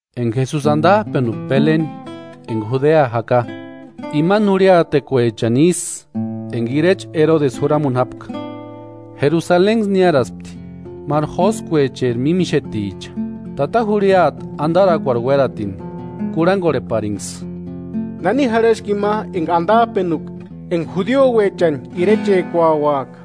Enka Jesusi antap'enupka Beleni enka Judea jaka, imani jurhiatekuechani isï enka irecha Erodesi juramuni jápka. Jerusalenksï niáraspti máru jóskuecheri mímixeticha, tata jurhiata antarakuarhu uératini kurhankorheparinksï: –¿Nani jarhaski ima enka antap'enuka ima enka judiuechani irechekuauaka?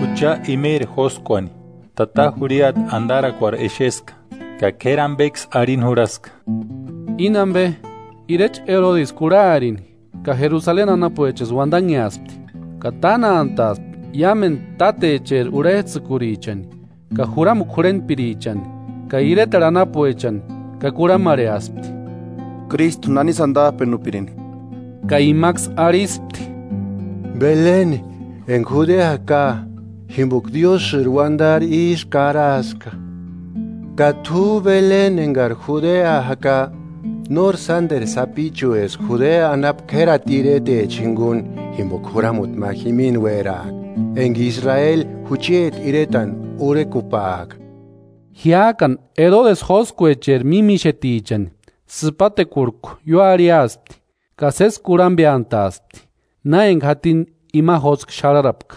Jucha imeri jóskuani tata jurhiata antarakuarhu exeska ka k'éri ampeksï arhini jurhaska. Íni ampe irecha Erodesi kurharini ka Jerusaleni anapuechaksï uantanheaspti. Ka tánantaaspti iámentu tátecheri urhets'ïkurichani ka juramukua jurhentpirichani ka iretarhu anapuechani ka kurhamarheaspti: –¿Krístu nanisï antap'enupirinki? Ka imaksï arhispti: –Beleni enka Judea jaka, jimpoka Diósïri uantari ísï karaska: “Ka t'u Beleni enkari Judea jaka, nóri sánteru sapichueska. Judea anapu k'érati iretecha jinkuni, jimpoka juramuti ma jimini uéraaka, enka Israeli jucheti iretani urhekupaaka.” Jiák'ani Erodesi jóskuecheri mímixetichani sïpatekuarhku ióarhiaspti ka sési kurhampeantaaspti na enka jatini ima jóskua xarharapka.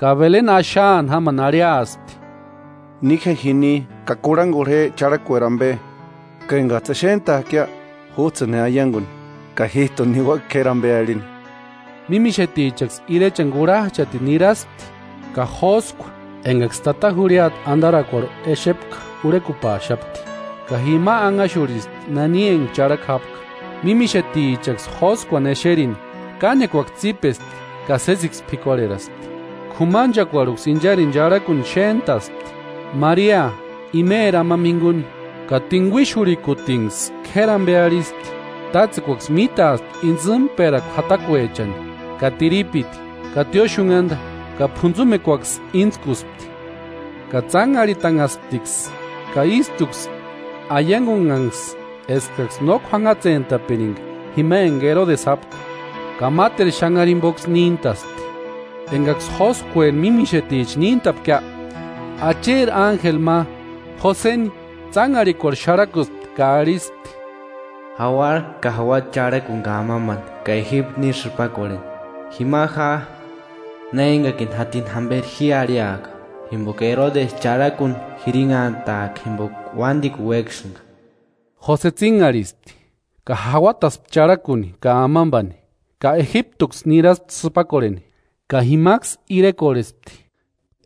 Ka Beleni axaani jámani arhiaspti: –Ni je jini ka sési kurhankorhe je charhakueri ampe ka enkats'ï exent'aakia júts'ïni je aiankuni, ka jít'uni niuaka k'éri ampe arhini. Mímixetichaksï irechani kurhach'atini niraspti, ka jóskua enkaksï tata jurhiata antarakuarhu exepka urhekupaaxapti ka jima anhaxurhispti nani enka charhaku jápka. Mímixetichaksï jóskuani exerini, kánekuaksï tsípespti ka sésiksï p'ikuarheraspti. K'umanchekuarhuksï incharini charhakuni xéntaspti, Maria imeri amampa jinkuni, ka tinkuixurhikutinksï k'éri ampe arhispti. Tátsekuaksï mítaaspti intsïmperakua jatakuechani ka tiripiti ka tióxunhanta ka p'untsumekuaksï íntskuspti. Ka tsánharhitanhasptiksï ka ístuksï aiankunhanksï eskaksï no k'uanhatsentapirinka jima enka Erodesi jápka, ka máteru xanhari jimpoksï níntaspti. Enkaksï jóskueri mímixeticha níntapkia, Acheri ánjeli ma Joseni tsánharhikuarhu xarhakuspti ka arhispti: “Jauara ka jauata charhakuni ka amampani ka Ejiptu ni sïpakorheni. Jima ja, na enkakini jatini jamperi ji arhiaka, jimpoka Erodesi charhakuni jirinhantaaka jimpoka uántikuni uéksïnka.” Jose tsínharhispti ka jauataspti charhakuni ka amampani ka Ejiptuksï niraspti sïpakorheni, ka jimaksï irekorhespti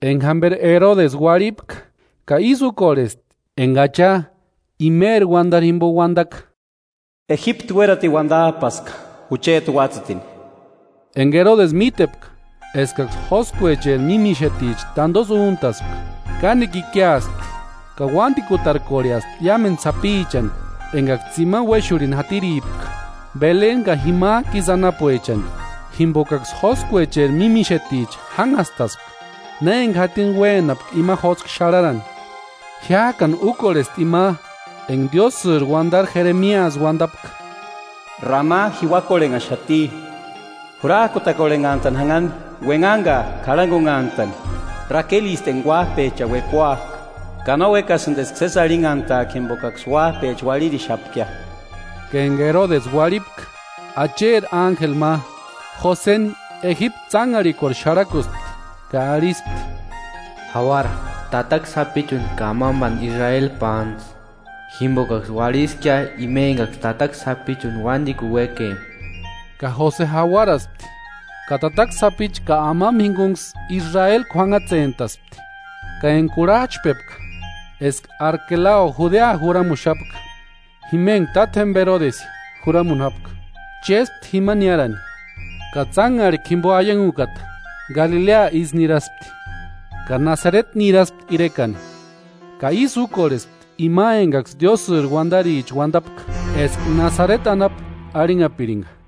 enka jamperi Erodesi uarhipka ka ísï úkorhesti enka Acha imeri uantari jimpo uantaka: “Ejiptu uératini uantap'aska jucheti uátsïtini.” Enka Erodesi mítepka eskaksï jóskuecheri mímixeticha tantosï úntaspka, kánekua ikiaspti ka uántikutarkorheaspti iámentu sapichani, enkaksï tsimani uéxurhini jatiripka Beleni ka jimak'u isï anapuechani, jimpokaksï jóskuecheri mímixeticha jánhastaspka na enka jatini uénapka ima jóskua xarharani. Jiák'ani úkorhesti ima enka Diósïri uantari Jeremiasï uantapka: “Rama jiuakorhenhaxati, jurak'utakorhenhantani janhani uenhani ka k'arhankunhantani; Rakelisti enka uáp'echani uekuak'a; ka no uékasïnti eska sési arhinhantaaka jimpokaksï uáp'echa uarhirixapkia.” Ka enka Erodesi uarhipka, Acheri ánjeli ma Joseni Ejiptu tsánharhikuarhu xarhakuspti, ka arhispti: “Jauara, tataka sapichuni ka amampani Israeli pántsï, jimpokaksï uarhiskia ima enkaksï tataka sapichuni uántikuni uékempka.” Ka Jose jauaraspti ka tataka sapichu ka amampa jinkunksï Israeli k'uanhatsentaspti. Ka enka kurhach'pepka eska Arkelao Judea juramuxapka, jima enka tátjempa Erodesi juramuni jápka, chéspti jima niárani. Ka tsánharhikua jimpo aiankukata Galilea isï niraspti, ka Nasareti niraspti irekani, ka ísï úkorhesti ima enkaksï Diósïri uantaricha uantapka eska Nasareti anapu arhinhapirinka.